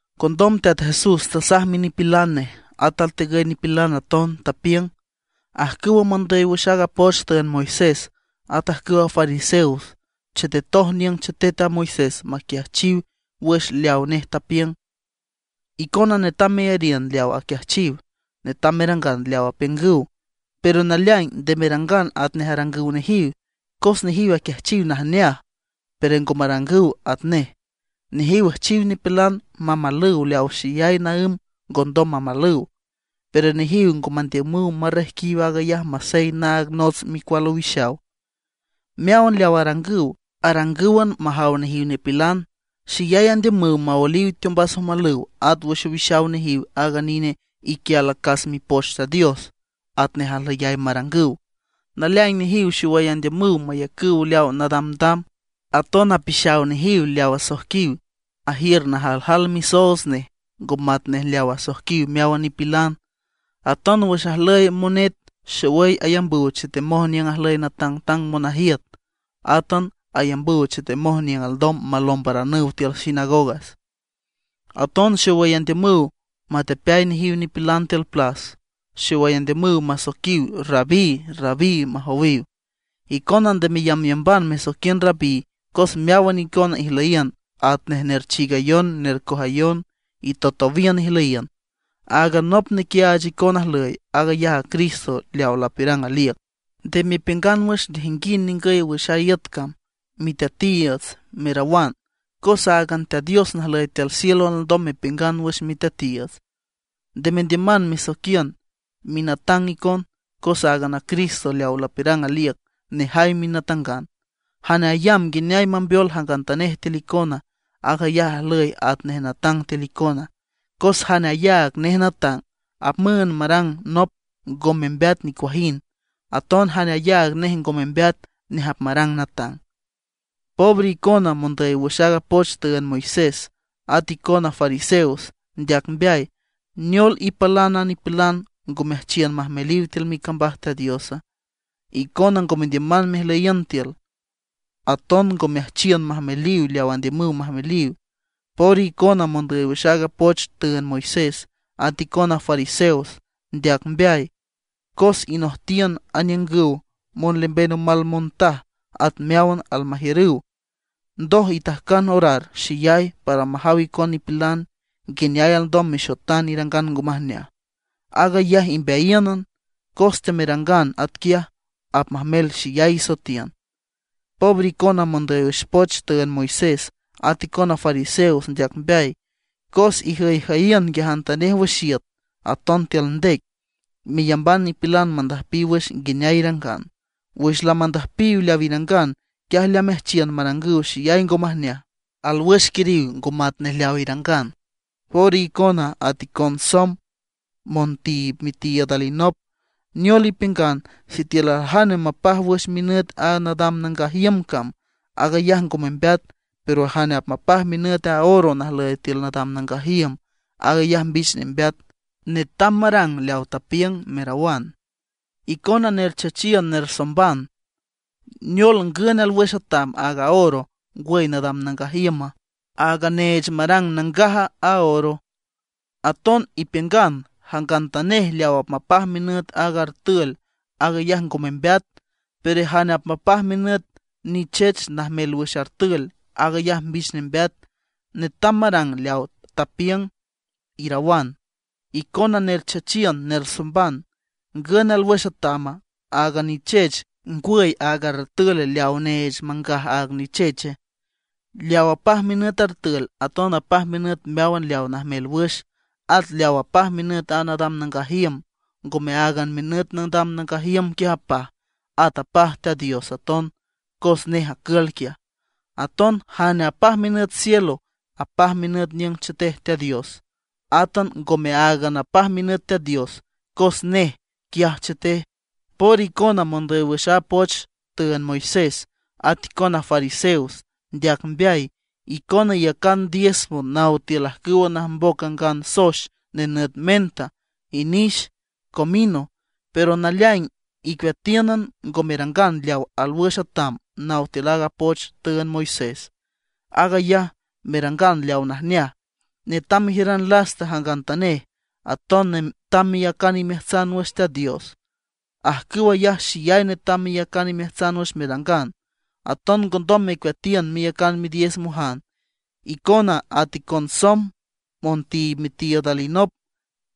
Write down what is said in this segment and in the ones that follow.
Condom Teat Jesús tasaj minipilan nej, at altigüy nipilan aton, tapiüng: ―Ajcüwa mondüy wüx aaga poch tüünd Moisés, at ajcüwa fariseos chetetoj niüng chetet a Moisés maquiajchiw wüx leawa nej tapiüng. Icona netam meyariün leaw aquiajchiw, netam merangan leaw apiüngüw; pero naleaing, nde merangan atnej arangüw nejiw, cos nejiw aquiajchiw najneaj, pero ngo marangüw atnej. Nejiw üjchiw nipilan mamalüw leaw xeyay naǘm ngondom mamalüw; pero nejiw ngo mandiümüw marrejquiw aag ayaj masey naag nots micual owixaw. Meáwan leaw arangüw, arangǘwan majaw nejiw nipilan. Xeyay andiümüw maoeliw teombas omalüw at wüx owixaw nejiw aaga nine iquial acas Mipoch Teat Dios atnej ajlüyay marangüw. Naleaing nejiw xowüy andiümüw mayacüw leaw nadamdam. Aton apixaw nejiw leaw asoijquiw ajiür najaljal misoots nej ngo matnej leaw asoijquiw meáwan nipilan. Aton wüx ajlüy monet xowüy ayambüw chetemoj niüng ajlüy natangtang monajiüt. Átan ayambüw chetemoj niüng alndom malombaranüw tiül sinagogas. Aton xowüy andiümüw matepeay nejiw nipilan tiül plas, xowüy andiümüw masoiquiw Rabí, Rabí, majowiw. ’Icona nde meyambyamban mesoiquiün Rabí, cos meáwan icona ijlüyiün atnej nerchiigayon, nercojayon itowtowíün ijlüyiün. Áagan nop nequiaach icon ajlüy, aag ayaj a Cristo leaw lapiürang aliüc. Nde mepiüngan wüx nejinguind ningüy wüx a iüt cam: miteatiiüts, merawan, cos áagan Teat Dios najlüy tiül cielo alndom mepiüngan wüx miteatiiüts. Nde mendiüman mesoiquiün minatang icon, cos áagan a Cristo leaw lapiürang aliüc, nejay minatangan. Jane ayamb nguineay mambeol jangantanej tiül icona, aag ayaj ajlüy atnej natang tiül icona. Cos jane ayaag nej natang, apmüünd marang nop ngo membeat nicuajind; aton jane ayaag nej ngo membeat, nej apmarang natang. ’¡Pobre icona, mondüy wüx aaga poch tüünd Moisés, at aton icona fariseos, ndeac mbeay! ¿Neol ipalan a nipilan, ngo meajchiün majmeliw tiül micambaj Teat Diosa? Icona ngo mendiüman mejlüyiün tiül, aton ngo meajchiün majmeliw leaw andiümüw majmeliw. ’¡Pobre icona, mondüy wüx aaga poch tüünd Moisés, at icona fariseos, ndeac mbeay! Cos inojtiün aniüngüw monlemben omal montaj at meáwan almajiürüw; ndoj itajcan orar xeyay para majaw icon nipilan, nguineay alndom mexotan irangan ngo majneaj, aag ayaj imbeayíünan. Cos temerangan atquiaj, apmajmel xeyay isoetiün. ’¡Pobre icona, mondüy wüx a poch tüünd Moisés, at icona fariseos, ndeac mbeay! Cos ijüyjüyiün nguiajantanej wüx iüt, aton tiül ndec, meyamban nipilan mandüjpiw wüx nguineay irangan. Wüx lamandüjpiw leaw irangan, quiaj lameajchiün marangüw xeyay ngo majneaj, alwüx quiriw ngo matnej leaw irangan. ’¡Pobre icona, at icon somb montiib mitiiüd alinop! Neol ipiüngan: “Sitiül aljane mapaj wüx minüt aaga nadam nangaj iüm cam, aag ayaj ngo membeat; pero jane apmapaj minüt a oro najlüy tiül nadam nangaj iüm, aag ayaj mbich nembeat, netam marang leaw tapiüng”, merawan. ¡Icona nerchachiün, nersomban! ¿Neol, ngün alwüx atam, aaga oro, ngwüy nadam nangaj iüma, aaga neech marang nangaj a oro? Aton ipiüngan: “Jangantanej leaw apmapaj minüt aaga artül aag ayaj ngo membeat; pero jane apmapaj minüt nichech najmel wüx artül, aag ayaj mbich nembeat, netam marang leaw tapiüng”, irawan. ¡Icona nerchachiün, nersomban! ¿Ngün alwüx atama, aaga nichech, ngwüy aaga artül leawa neech mangaj aaga nicheche? Leaw apaj minüt artül, aton apaj minüt meáwan leaw najmel wüx. At leaw apaj minüt a nadam nangaj iüm, ngome áagan minüt nadam nangaj iüm quiaj apaj, at apaj Teat Dios aton cos nej acül quiaj. Aton jane apaj minüt cielo, apaj minüt niüng chetej Teat Dios. Ngome áagan aton apaj minüt Teat Dios cos nej quiaj chetej. ’¡Pobre icona, mondüy wüx a poch tüünd Moisés, at icona fariseos, ndeac mbeay! Icona iyacan diezmo naw tiül ajcüwa najmboc angan soex nenüt menta, inix, comino; pero naleaing icueatíünan ngo merangan leaw alwüx atam naw tiül aaga poch tüünd Moisés. Aag ayaj, merangan leaw najneaj, netam mejiüran lasta jangantanej, aton netam meyacan imeajtsan wüx Teat Dios. Ajcüw ayaj xeyay netam meyacan imeajtsan wüx merangan. Aton ngondom mecueatiün meyacan midiezmojan. ¡Icona at icon somb montiib mitiiüd alinop,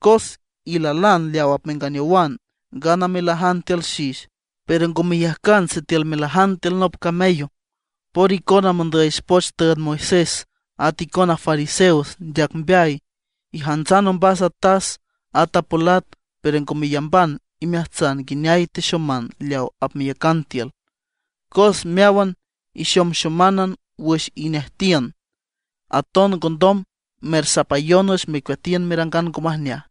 cos ilalan leaw apmenganeowan ngana melajan tiül xix, pero ngo meyajcan sitiül melajan tiül nop camello! ’¡Pobre icona mondüy wüx poch tüünd a Moisés, at icona fariseos, ndeac mbeay! Ijantsan ombas a tas, at a polat, pero ngo meyamban imeajtsan nguineay texoman leaw apmeyacan tiül, cos meáwan ixomxománan wüx inejtiün. Aton ngondom mersapayon wüx mecueatiün merangan ngo majneaj.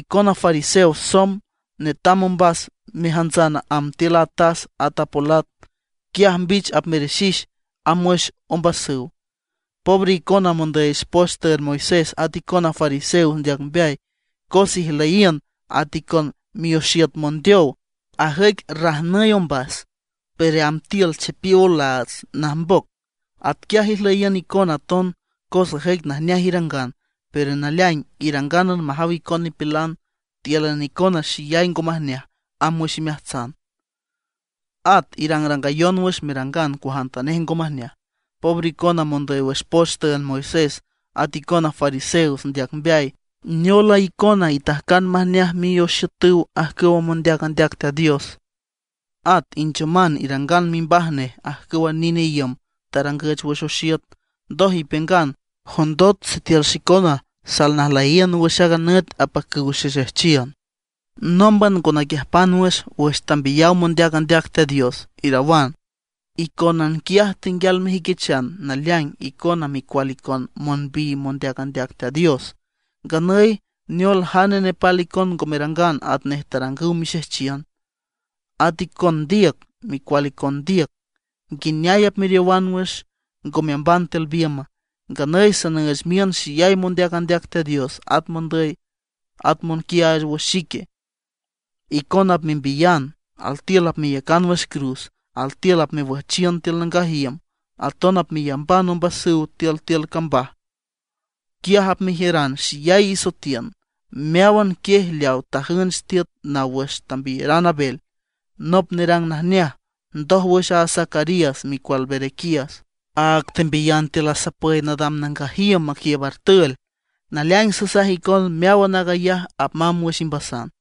¡Icona fariseos somb! Netam ombas mejantsan amb tiül a tas at a polat, quiaj mbich apmerixix amb wüx ombasüw. ’¡Pobre icona mondüy wüx poch tüünd a Moisés, at icona fariseos, ndeac mbeay! Cos ijlüyiün at icon mioxiüt mondeow. Ajüic rajnüy ombas; pero amb tiül chipiow olaats, najmboc. Atquiaj ijlüyiün icona aton, cos ajüic najneaj irangan, pero naleaing irangánan majaw icon nipilan. Tíülan icona xeyay ngo majneaj amb wüx imeajtsan, at irangrangayon wüx merangan cuajantanej ngo majneaj. ’¡Pobre icona mondüy wüx poch tüünd Moisés, at icona fariseos, ndeac mbeay! Neol a icona itajcan majneaj mioxiütüw ajcüwa mondeac andeac Teat Dios. At inchoman irangan mimbaj nej ajcüwa nine iüm tarangüch wüx oxiüt. Ndoj ipiüngan: “Jondot sitiül xicona salnajlüyiün wüx aaga nüt apacüw xexejchiün, nómban ngo naquiüjpan wüx, wüx tambiyaw mondeac andeac Teat Dios”, irawan. Icónan quiaj tenguial mejüiquichan naleaing icona micual icon monbiy mondeac andeac Teat Dios. ¡Nganüy neol jane nepal icon ngo merangan atnej tarangüw mixejchiün! ’¡At icon ndiüc, micual icon ndiüc! ¿Nguineay apmeriowan wüx, ngo meamban tiül biümba? Nganüy sanüüch miün xeyay mondeac andeac Teat Dios, at mondüy, at monquiaach wüx xique. Icona apmembiyan, altiül apmeyacan wüx cruz, altiül apmewüjchiün tiül nangaj iüm. Aton apmeyamban ombasüw tiül tiül cambaj. Quiaj apmejiüran xeyay isoetiün, meáwan quiej leaw tajünch tiüt naw wüx tambiyeran Abel, nop nerang najneaj, ndoj wüx a Zacarías micual Berequías, áag tembiyan tiül asapüy nadam nangaj iüm maquiiüb artül. Naleaing sasaj icon, meáwan aag ayaj apmamb wüx imbasan.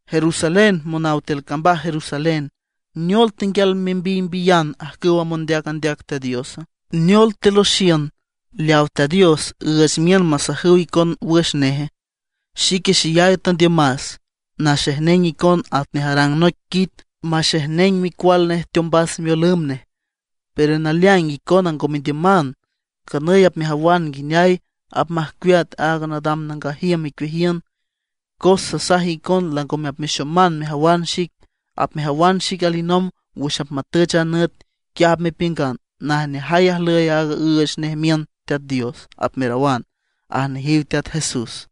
’¡Jerusalén, monaw tiül cambaj Jerusalén! ¿Neol tenguial membiymbiyan ajcüwa mondeac andeac Teat Diosa? ¿Neol teloxiün leawa Teat Dios üüch miün masajüw icon wüx neje? ¡Xique xeyay tandiümas naxejneng icon atnej arang noic quit maxejneng micual nej teombas miolümb nej; pero naleaing icona ngo mendiüman! Nganüy apmejawan nguineay apmajcueat aaga nadam nangaj iüm icueajiün. Cos sasaj icon langome apmexoman mejawan xic. Apmejawan xic alinomb wüx apmatüch a nüt, quiaj apmepiüngan: “Najneajay ajlüy aaga üüch nej miün Teat Dios”, apmerawan ―aj nejiw Teat Jesús.